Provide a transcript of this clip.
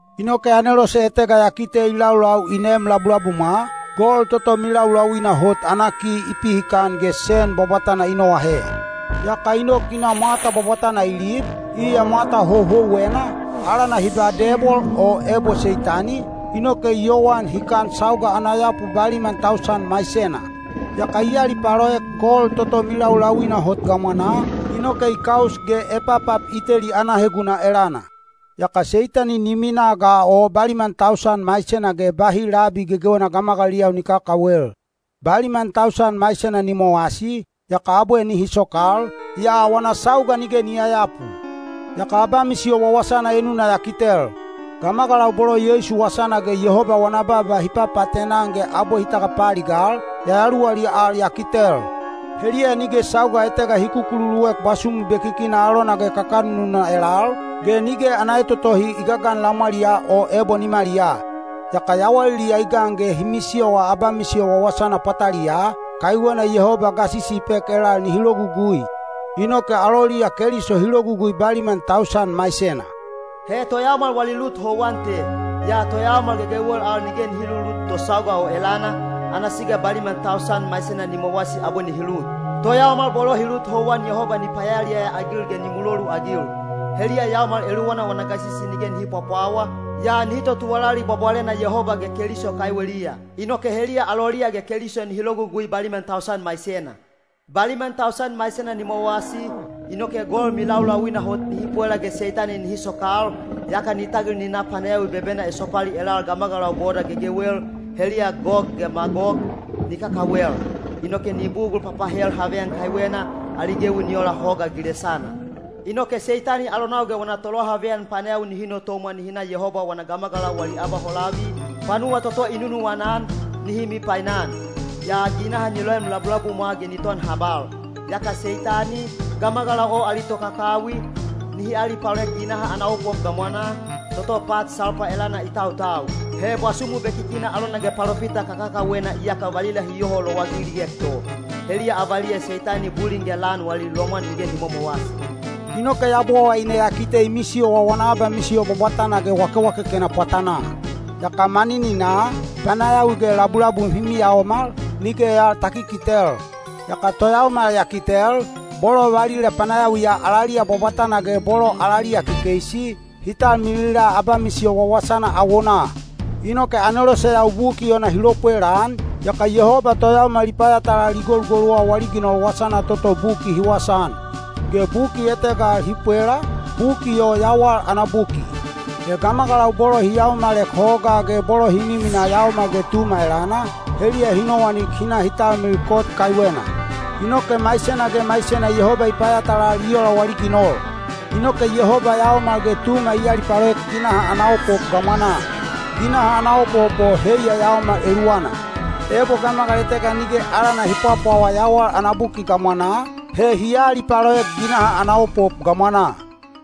Inoke anelose etega ya kite i laulau i neem labulabumwa, gol toto milaulauina hot ana ki i pihikan ge sen bwabwatana i noahe. Yaka i nok i na mwata bwabwatana i lib, iya mwata houhouwena, alana hi ba Debol o ebo Seitani, inoke i yowan hikan sauga ana yapu baliman tausan maisena. Yaka i alipaloek gol toto milaulauina hot gamwanaa, inoke i kaus ge epapap i teli ana heguna elana. Yaka Seitani ni minaa ga o baliman tausan maisena ge bahi labi gegewena gamagaliliyau ni kakawel. Baliman tausan maisena ni mowasi, yaka abwe nihi sokal, yaa wana sauga nige ni yayapu. Yaka abamisiyo wawasana enuna ya kitel. Gamagalau bolo Yeisu wasana ge Yehoba wana baaba hi papaatena-an ge abwe hi tagapaaligal, yayaluwaliya al ya kitel. Heliya nige sauga etega hi kukululuek bwasumu bekikina alona ge kakanununa elal, ge nige ana etotohi i gagan lamwaliyaa o ebo nimaliyaa. Yaka yawaliliya i gan ge hi misiyowa abamisiyo wawasana pwataliyaa, kaiwena Yehoba gasisi i pek elal nihi logugui. Inoke aloliya Keliso hi logugui baliman tausan maisena. He toyaomal wali lut houwan te. Yaa toyaomal gegewel al nige hi lulut to sauga o elana, ana siga baliman tausan maisena ni mowasi abwe nihi lut. Toyaomal bolo hi lut houwan Yehoba ni payaliyaya-agil ge ni muloluagil. Heliya yaomal eluwana wana gasisi nige nihi pwapwawa, yaa nihi totuwalali bwabwalena Yehoba ge Keliso kaiweliya. Inoke heliya aloliya ge Keliso nihi logugui baliman tausan maisena. Baliman tausan maisena ni mowasi, inoke gol milaulauina hot nihi pwela ge Seitani nihi sokal, yaka ni tagil ni na panayawi bebena esopali elal gamagalau boda gegewel, heliya Gog ge Magog, ni kakawel. Inoke ni bugul papahel haveyan kaiwena, ali gewi ni ola hoga gilesana. Inoke Seitani alonau ge wana tolohaveyan panayawi nihi notomwa nihi na Yehoba wana gamagalau wali abaholavi, panuwa toto i nunuwana-an, nihi mipainan. Yaa ginaha ni loem labulabumwa ge ni ton habal. Yaka Seitani, gamagalau o ali tokakawi, nihi alipaloek ginaha ana opop gamwanaa, toto pat salpa elana i tautau. He bwasumu bekikina alona ge palopita kakakawena iyaka valila hi yoho lowagiliek to. Heliya avaliya Seitani bulin ge lan wali lomwan nige ni momowasi. Inoke Yabowaine ya kite i misiyowa wana abamisiyo bwabwatana ge wakewakekena pwatanaa. Yaka manininaa, panayawi ge labulabum hi miyaomal, nige al ta kikitel. Yaka toyaomal ya kitel, bolo valila panayawiya alaliya bwabwatana ge bolo alaliya kekeisi, hi talmilila abamisiyo wawasana awonaa. Inoke aneloseyau buki ona hi lopwelaan, yaka Yehoba toyaomal i payatalal i golugoluwa wali ginol wasana toto buki hi wasaan. Ge buki etega al hi pwela, buki o yawal ana buki. He gamagalau bolo hi yaomalek hogaa ge bolo hi miminaa Yaomal ge Tuma elana, heliya hi nowanik hi talmil kot kaiwena. Inoke maisena ge maisena Yehoba i payatalal i ola wali ginol. Inoke Yehoba Yaomal ge Tuma i alipaloek ginaha ana opop gamwanaa. Ginaha ana opop o heiya yaomal eluwana. Ebo gamagal etega nige alana hi pwapwawa yawal ana buki gamwanaa, he hi aalipaloek ginaha ana opop gamwanaa.